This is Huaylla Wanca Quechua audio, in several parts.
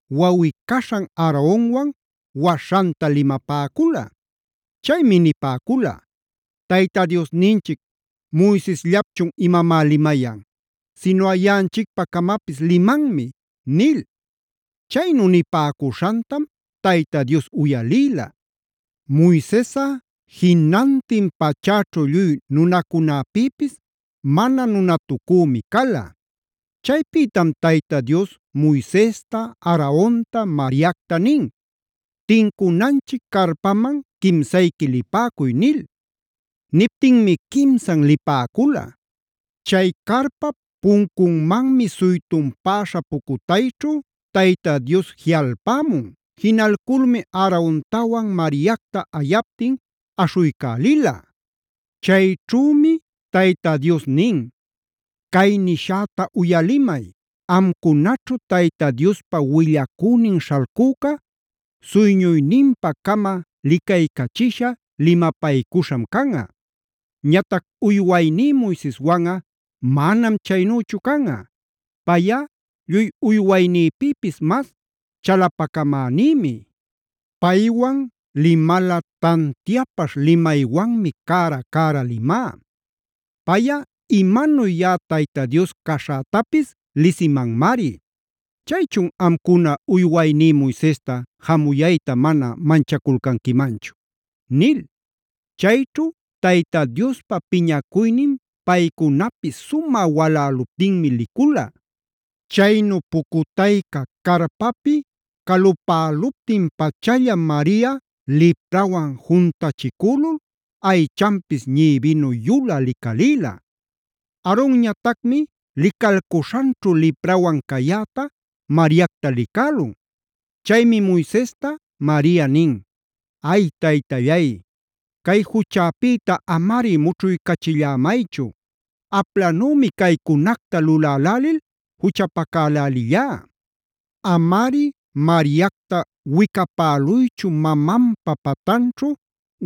wawꞌi-caśhan Aaronwan waśhanta limapäcula. Chaymi nipäcula: Tayta Diosninchic Moisesllapchun imamá limayan. Sinuꞌa yaꞌanchicpa-camapis limanmi” nil. Chaynu nipäcuśhantam Tayta Dios uyalïla. Moisesꞌa jinantin pachäćhu lluy nunacunäpïpis mana nunatucümi cala. Chaypïtam Tayta Dios Moisesta, Aaronta, Mariacta nin: “Tincunanchic carpaman quimsayqui lipäcuy” nil. Niptinmi quimsan lipäcula. Chay carpap puncunmanmi suytunpäśha pucutayćhu Tayta Dios jiꞌalpämun. Jinalculmi Aarontawan Mariacta ayaptin aśhuycälila. Chayćhümi Tayta Dios nin: “Cay nishäta uyalimay: Amcunaćhu Tayta Diospa willacünin śhalcüca suyñuyninpa-cama licaycachisha, limapaycuśham canꞌa. Ñatac uywayní Moiseswanꞌa manam chaynüchu canꞌa. Payꞌa lluy uywaynïpïpis mas chalapacamänïmi. Paywan limalꞌa tantiapaśh limaywanmi cära-cära limá. Payꞌa imanuy yaꞌa Tayta Dios caśhätapis lisimanmari. ¿Chaychun amcuna uywayní Moisesta jamuyayta mana manchaculcanquimanchu?” nil. Chayćhu Tayta Diospa piñacuynin paycunapi sumä waläluptinmi licula. Chaynu pucutayca carpapi calupäluptin pachallam Maria liprawan juntachicülul aychanpis ñïbinu yulä licalïla. Aaronñatacmi licalcuśhanćhu liprawan cayäta Mariacta licälun. Chaymi Moisesta Maria nin: “¡Ay, Taytallay! Cay juchäpïta amari mućhuycachillämaychu. Aplanümi caycunacta lulälälil juchapacälälillá. Amari Mariacta wicapäluychu mamanpa patanćhu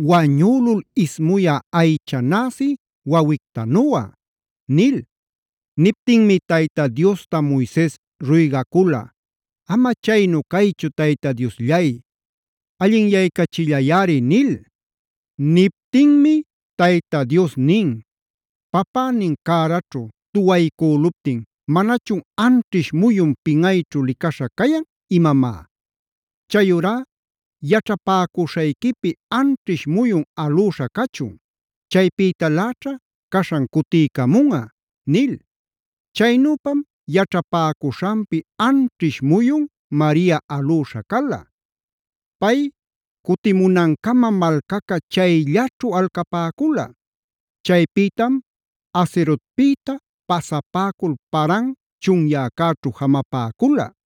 wañülul ismuyä aycha näsi wawictanuꞌa” nil. Niptinmi Tayta Diosta Moises ruygacula: “Ama chaynu caychu Tayta Diosllay, allinyaycachillayꞌari” nil. Niptinmi Tayta Dios nin: “Papänin cäraćhu tuwapaycüluptin ¿manachun anćhish muyun pinꞌayćhu licaśha cayan imamá? Chayurá yaćhapäcuśhayquipi anćhish muyun alüśha cachun.b Chaypïtaläćha caśhan cutiycamunꞌa” nil. Chaynüpam yaćhapäcuśhanpi anćhish muyun Maria alüśha cala. Pay cuticamunancamam malcaca chayllaćhu alcapäcula. Chaypïtam Hazerotpïta pasapäcul Paran chunyäcäćhu jamapäcula.